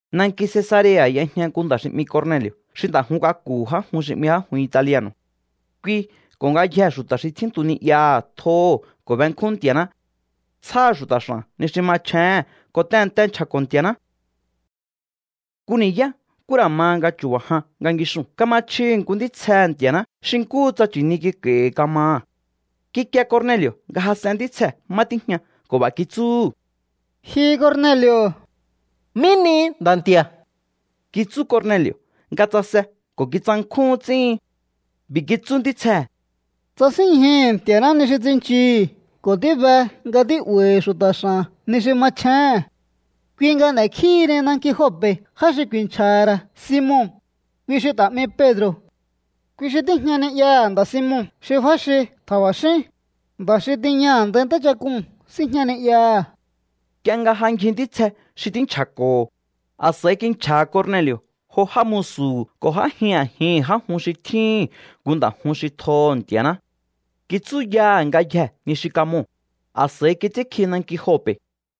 Nanki Cesarea̱ y'ejña nku nda̱ xi 'mi Corneli̱o̱ xi nda̱ jun k'aku̱hu̱ já jun xi 'mi Já jun Italiano̱. Kui ko̱ ngayjee̱ xu̱ta̱ xi tjíntu ni'yaha̱ tjoho̱ ko̱ benkjún Nti̱a̱ná. Tsjáha̱ xu̱ta̱ x'a̱n ni xi machjéhe̱n ko̱ tehe̱nte nchja̱ko̱ Nti̱a̱ná. Nku ni̱yá nkú ra̱ ma nga chu̱ba̱ jan nga ngixuu̱n kama chjihi̱ nku ntítsjehe̱ Nti̱a̱ná xi nkúhu tsa nchi̱ni kik'a̱i̱hi̱ kamaha̱. Kikie Corneli̱o̱ nga jas'en ntítsjee̱ má tíjña ko̱ b'a̱ kitsúhu̱: —¡Ji Corneli̱o̱! —¿Mí nihi, Nda̱ Nti̱a̱? —kitsú Corneli̱o̱ nga tsase ko̱ títsankjúhún ts'íhin. B'i̱ kitsú ntítsjee̱: —Tsasínñjuhu̱ Nti̱a̱ná ni xi tsinchihi̱ ko̱ tíbe nga tí'ba̱i̱hi̱ xu̱ta̱ x'a̱n ni xi machjéhe̱n. Kui nga n'e̱kjíhini nanki Jope̱ já xi ku̱i̱nchja̱ha̱ ra̱ Simon, kui xi ta̱ 'mi Pedro̱. Kui xi tíjña ni'yaha̱ nda̱ Simon xi f'áxi tja̱ba̱xín, nda̱ xi tiña a̱ndai ntáchak'uu̱n síjña ni'yaha̱. Nk'ie nga ja ngji ntítsje xi tínchja̱ko̱ho̱, a̱s'a̱i kinchja̱ha̱ Corneli̱o̱ jo já musu̱hu̱ ko̱ j'ájin a̱jihi̱n já jun xi tjíhi̱n nku nda̱ jun xi tjoho̱ Nti̱a̱ná. Kitsúyaha̱ ngayjee̱ ni xi kamoo̱, a̱s'a̱i kits'ínkji nanki Jope̱.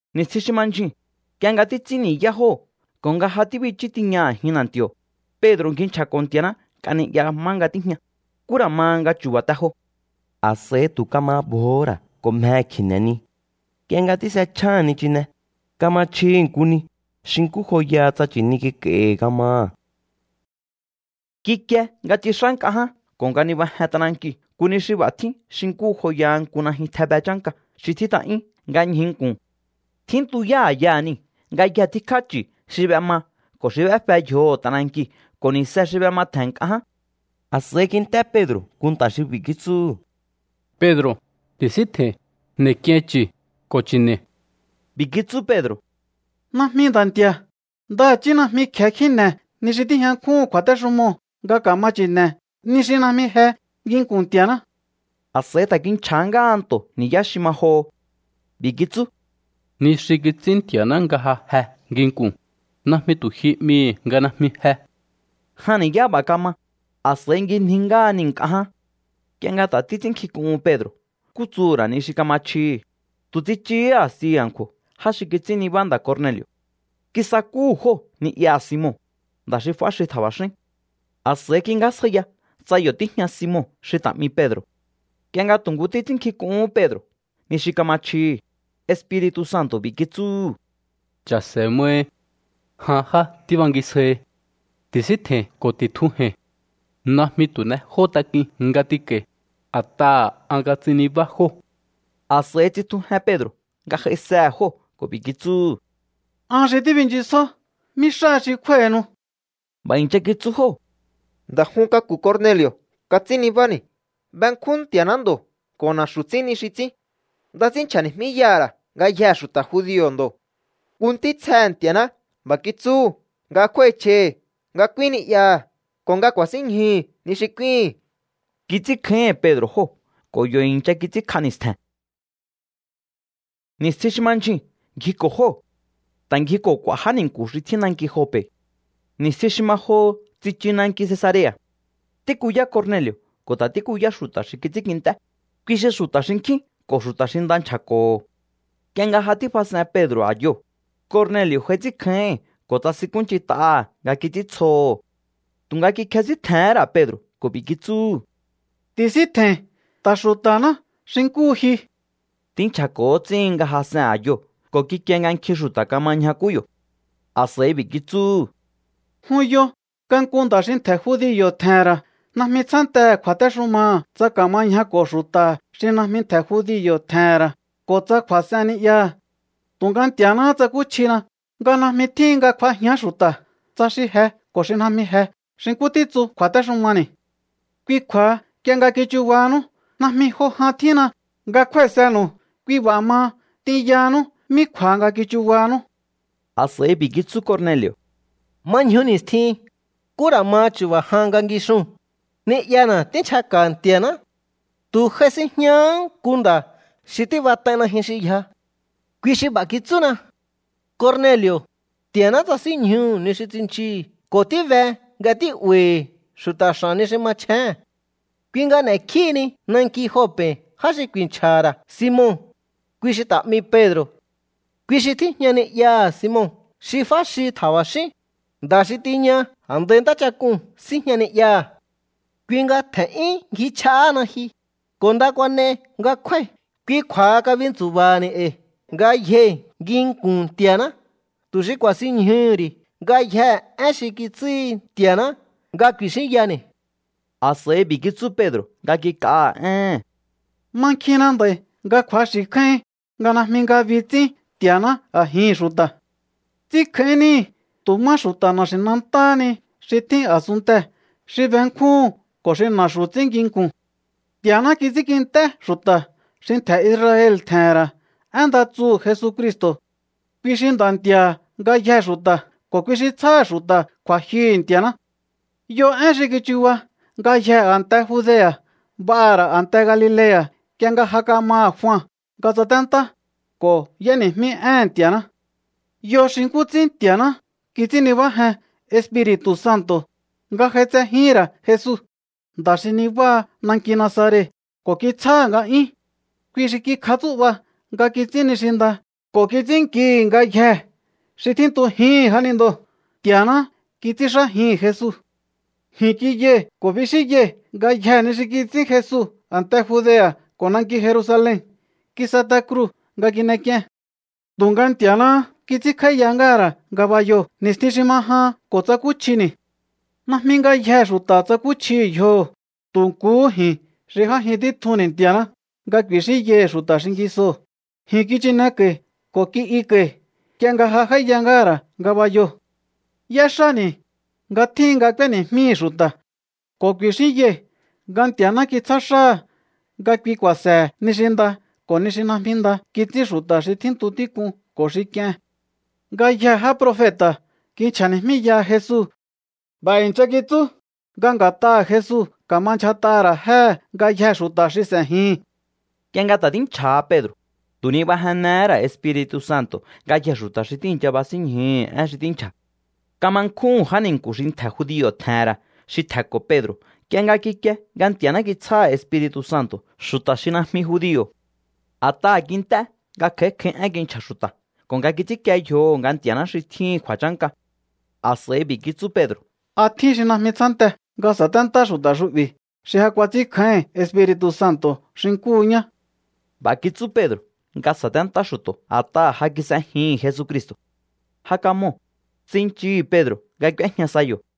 Ni̱stjin xi ma ndyjuu̱n, nk'ie nga títs'ín ni̱yá jóo̱ ko̱ nga ja tíbichú tiña a̱jin na̱nti̱o̱, Pedro̱ ngji nchja̱ko̱ Nti̱a̱ná nk'a ni'ya má nga tíjña, nkú ra̱ ma nga chu̱ba̱ te jo. A̱s'a̱i tu̱ kama bjohó ra̱ ko̱ mjehe̱ kji̱ne̱ ni. Nk'ie nga tís'echjáha̱n nichine, kama chjihi̱ nku ni xi nkú joyaha tsa nchi̱ni kik'a̱i̱hi̱ kamaha̱. Kikie nga tsix'á nk'a ján ko̱ nga nibajen t'anankiu̱ nku ni xi b'a̱ tjín xi nkú joyaha nku najyun tjebe chánka xi tjít'a'yún nga ñjuu̱ nku̱n. Tjíntuyá a̱yaha̱ niu̱ ngayje tíkjá chu̱ xi b'ema ko̱ xi b'éfe yjoho̱ t'anankiu̱ ko̱ ni̱se xi b'ematje̱n nk'a ján. A̱s'a̱i kint'é Pedro̱ nku nta̱ xi b'i̱ kitsúhu̱: —Pedro̱, ti̱síntje̱i̱n. N'e̱k'iein chu̱ ko̱ chi̱ne̱i̱. B'i̱ kitsú Pedro̱: —Najmi, Nda̱ Nti̱a̱. Ndaha̱chí najmi kje̱e kjíne̱ ni xi tíjña nkjúhu̱n kju̱a̱téxumoo̱ nga ka̱ma chi̱ne̱, ni xi najmi je nginku̱n Nti̱a̱ná. A̱s'a̱i ta̱ kinchja̱ ngáha nto̱ ni̱yá xi ma joho. B'i̱ kitsú: —Ni xi kits'ín Nti̱a̱ná nga ja je nginku̱n, najmi tu̱ ji 'mihi̱ nga najmi je. Jan ni̱yá b'a̱ kama, a̱s'a̱i ngjinji ngáha niu̱ nk'a ján. Nk'ie nga ta̱ títs'ínnkjink'uhun Pedro̱ nkú tsuhu̱ ra̱ ni xi kama chjihi̱, tu̱ tsichuhú a̱sti a̱nkju̱o̱ já xi kits'ín nibá nda̱ Corneli̱o̱. Kisakúhu̱ jóo̱ ni'yaha̱ Simon, nda̱ xi f'áxi tja̱ba̱xín. A̱s'a̱i kingjásjaiya tsa yo̱ tíjña Simon xi ta̱ 'mi Pedro̱. Nk'ie nga tu̱ nku títs'ínnkjink'uhún Pedro̱ ni xi kama chjihi̱, Espiri̱tu̱ Santo̱ b'i̱ kitsúhu̱: —Cha̱se̱ mai. Jan já tíbangisjaihi. Ti̱síntje̱i̱n ko̱ ti̱tjuje̱i̱n. Najmi tu̱ n'ejó tak'uin nga t'inko̱i̱, a̱t'aha̱ an kats'in nibá jóo̱. A̱s'a̱i tsitjujen Pedro̱ nga j'aisehe̱ jóo̱ ko̱ b'i̱ kitsúhu̱: —An xi tíbinchisjó. ¿Mí xáha xi kj'úái̱hinu? B'a̱ i̱ncha kitsú jóo̱: —Nda̱ jun k'aku̱ Corneli̱o̱ kats'ín nibáni̱. Benkjún Nti̱a̱ná ndo̱ ko̱ na̱xu̱ ts'ín ni xi ts'ín. Nda ts'ín nchja̱ni̱jmíyaha̱ ra̱ ngayjee̱ xu̱ta̱ judio̱ ndo̱. Nku ntítsjehe̱ Nti̱a̱ná b'a̱ kitsúhu̱ nga kju̱a̱íchj'aihi nga k'úín ni'yaha̱ ko̱ nga ku̱a̱sínñjuhu̱ ni xi k'úíhi̱n. Kits'ínkjáíhi̱n Pedro̱ jóo̱ ko̱ yo̱ i̱ncha kits'ínkj'a ni̱stje̱n. Ni̱stjin xi ma ndyjuu̱n ngjiko̱ jóo̱. Ta̱ ngjiko̱ k'u̱a̱ já ni̱nku̱ xi tjín nanki Jope̱. Ni̱stjin xi ma joho tsichu nanki Cesarea̱. Tíkuyá Corneli̱o̱ ko̱ ta̱ tíkuyá xu̱ta̱ xi kits'ínkint'é, kui xi xu̱ta̱ xinkjín ko̱ xu̱ta̱ xi nda nchja̱ko̱ho̱. Nk'ie nga ja tífas'en Pedro̱ a̱yoo̱, Corneli̱o̱ j'ai ts'ínkjáíhi̱n ko̱ tsasinkúnch'int'aha̱ nga kits'íntsjoho̱. Tu̱nga kikjesíntje̱hén ra̱ Pedro̱ ko̱ b'i̱ kitsúhu̱: —Ti̱síntje̱i̱n. Ta̱ xu̱ta̱ná xi nkúhu ji. Tínchja̱ko̱ ts'íhin nga jas'en a̱yoo̱ ko̱ kikie nga nkjin xu̱ta̱ kama ñjakú yo̱. A̱s'a̱i b'i̱ kitsúhu̱: —Jun yo nga nku nda̱ xi ntje̱ judio̱ tje̱he̱n ra̱ najmi tsjántehe̱ kju̱a̱téxumaha̱ tsa ka̱ma ñjako̱ xu̱ta̱ xi najmi ntje̱ judio̱ tje̱he̱n ra̱ ko̱ tsa kju̱a̱s'en ni'yaha̱. Tu̱nga Nti̱a̱náhá tsakúchjina nga najmi tjíhin nga kj'uajíán xu̱ta̱, tsa xi je ko̱ xi najmi je xi nkú títsu kju̱a̱téxumani̱. Kui kju̱a̱ha nk'ie nga kichubahanú, najmi jo jan tjíhinna nga kjúái̱senu̱u. Kui b'a̱ maha, t'inyahanú mí kju̱a̱ha nga kichubahanú. A̱s'a̱i b'i̱ kitsú Corneli̱o̱: —Ma ñju ni̱stjin, nkú ra̱ ma chu̱ba̱ jan nga ngixuu̱n, ni'yana̱ tínchjaka̱ Nti̱a̱ná. Tu̱ j'ai sinjñahá nku nda̱ xi tíb'at'ai najyun xi yja. Kui xi b'a̱ kitsúna: “Corneli̱o̱, Nti̱a̱ná tsasínñjuhu̱ ni xi tsinchihi̱ ko̱ tíbe nga tí'ba̱i̱hi̱ xu̱ta̱ x'a̱n ni xi machjéhe̱n. Kui nga n'e̱kjíhini nanki Jope̱ já xi ku̱i̱nchja̱ha̱ ra̱ Simon, kui xi ta̱ 'mi Pedro̱. Kui xi tíjña ni'yaha̱ Simon xi f'áxi tja̱ba̱xín, nda̱ xi tiña a̱ndai ntáchak'uu̱n síjña ni'yaha̱.” Kui nga tje̱n'yún ngjichj'ahána ji, ko̱ nda kuan'ei nga kjúái̱. Kui kju̱a̱ha kabintsu̱ba̱ha̱ni̱ e̱i̱ ngayjei̱ nginku̱n Nti̱a̱ná tu̱ xi k'u̱a̱sinñjuhu̱ ri̱ ngayjee̱ én xi kitsúhi Nti̱a̱ná nga ku̱i̱xínyani̱. A̱s'a̱i b'i̱ kitsú Pedro̱ nga kik'aha̱ éhe̱n: —Mankjinna nd'a̱i̱ nga kju̱axi̱ kjáíhin nga najmi ngabi ts'ín Nti̱a̱ná a̱jihi̱n xu̱ta̱. Ts'ínkjáín níhi̱ tu̱ má xu̱ta̱ na̱xi̱nantáha ni xi tjín a̱sunntee̱ xi benkjúhu̱n ko̱ xi na̱xu̱ ts'ín nginku̱n. ’Nti̱a̱ná kits'ínkint'é xu̱ta̱ xi ntje̱ Israel tje̱he̱n ra̱ én nda tsuhu̱ Jesucristo̱. Kui xi Nda̱ Nti̱a̱ha̱ ngayjee̱ xu̱ta̱ ko̱ kui xi tsjáha̱ xu̱ta̱ kju̱a̱jyuhu̱ Nti̱a̱ná. Yo én xi kichuba ngayjee̱ a̱nte Judea̱, b'aha̱ ra̱ a̱nte Galilea̱ nk'ie nga ja kamaha̱ Jua nga tsaténtá ko̱ y'éni̱jmí éhe̱n Nti̱a̱ná. Yo xi nkú ts'ín Nti̱a̱ná kits'ín nibájen Espiri̱tu̱ Santo̱ nga j'aitsejíhi̱n ra̱ Jesu, nda̱ xi nibáha nanki Nazaret, ko̱ kitsjáha̱ nga'yún. Kui xi kikjatsú'ba nga kits'ín ni xi nda ko̱ kits'ínnkihi̱ ngayjee̱ xi tjíntujíhi̱n jánindoo̱. Nti̱a̱ná kits'ínxájihi̱n Jesu. ’Ji̱n kiyai̱ ko̱ bixíyai̱ ngayjee̱ ni xi kits'ín Jesu a̱nte Judea̱ ko̱ nanki Jerusalen. Kis'et'a kruu̱ nga kin'ek'ien. Tu̱nga Nti̱a̱náhá kits'ínkj'áíya ngáha̱ ra̱ ngabayoo̱ ni̱stjin xi ma jahan ko̱ tsakúchjini̱. Najmi ngayjee̱ xu̱ta̱ tsakúchjihi̱ yjoho̱, tu̱ nkuhú ji̱n xi j'ájin títjunni̱ Nti̱a̱ná nga ku̱i̱xínyai̱ xu̱ta̱ xingisoo̱. Ji̱n kichineko̱i̱ ko̱ ki'yuko̱i̱ nk'ie nga ja j'áíya ngáha̱ ra̱ ngabayoo̱. ’Y'éxáni̱ nga tjíhin nga k'úéni̱jmíhi̱ xu̱ta̱ ko̱ ku̱i̱xínyai̱ nga Nti̱a̱ná kitsjá xáha̱ nga kui ku̱a̱se̱he̱ ni xi nda ko̱ ni xi najmi nda kits'ín xu̱ta̱ xi tjíntu tík'un ko̱ xi k'ien. Ngayjee̱ já profeta̱ kinchja̱ni̱jmíyaha Jesu. B'a̱ i̱ncha kitsú nga nga̱t'aha̱ Jesu ka̱ma ndyjat'aha̱ ra̱ jéhe̱ ngayjee̱ xu̱ta̱ xi s'e̱jihi̱n. Nk'ie nga ta̱ tínchja̱ha Pedro̱, tu̱ nibajennehé ra̱ Espiri̱tu̱ Santo̱ ngayjee̱ xu̱ta̱ xi tíi̱ncha basínñjuhu̱ én xi tínchja̱. Kama nkjúhu̱n já ni̱nku̱ xi ntje̱ judio̱ tje̱he̱n ra̱ xi tje̱nko̱ Pedro̱ nk'ie nga kikie nga Nti̱a̱ná kitsjáha̱ Espiri̱tu̱ Santo̱ xu̱ta̱ xi najmi judio̱. A̱t'aha̱ kint'é nga kj'a̱í kj'a̱í én kinchja̱ xu̱ta̱ ko̱ nga kits'ínkie yjoho̱ nga Nti̱a̱ná xi tjíhi̱n kju̱a̱chánka. A̱s'a̱i b'i̱ kitsú Pedro̱: —¿A tjín xi najmi tsjánte nga sa̱téntá xu̱ta̱ xu'bi̱ xi ja kuats'ínkjáíhi̱n Espiri̱tu̱ Santo̱ xi nkúhu ñá? B'a̱ kitsú Pedro̱ nga sa̱téntá xu̱to̱ a̱t'aha̱ ja kis'ejihi̱n Jesucristo̱. Ja kamoo̱, tsinchihi̱ Pedro̱ nga k'úéjña sa yo̱.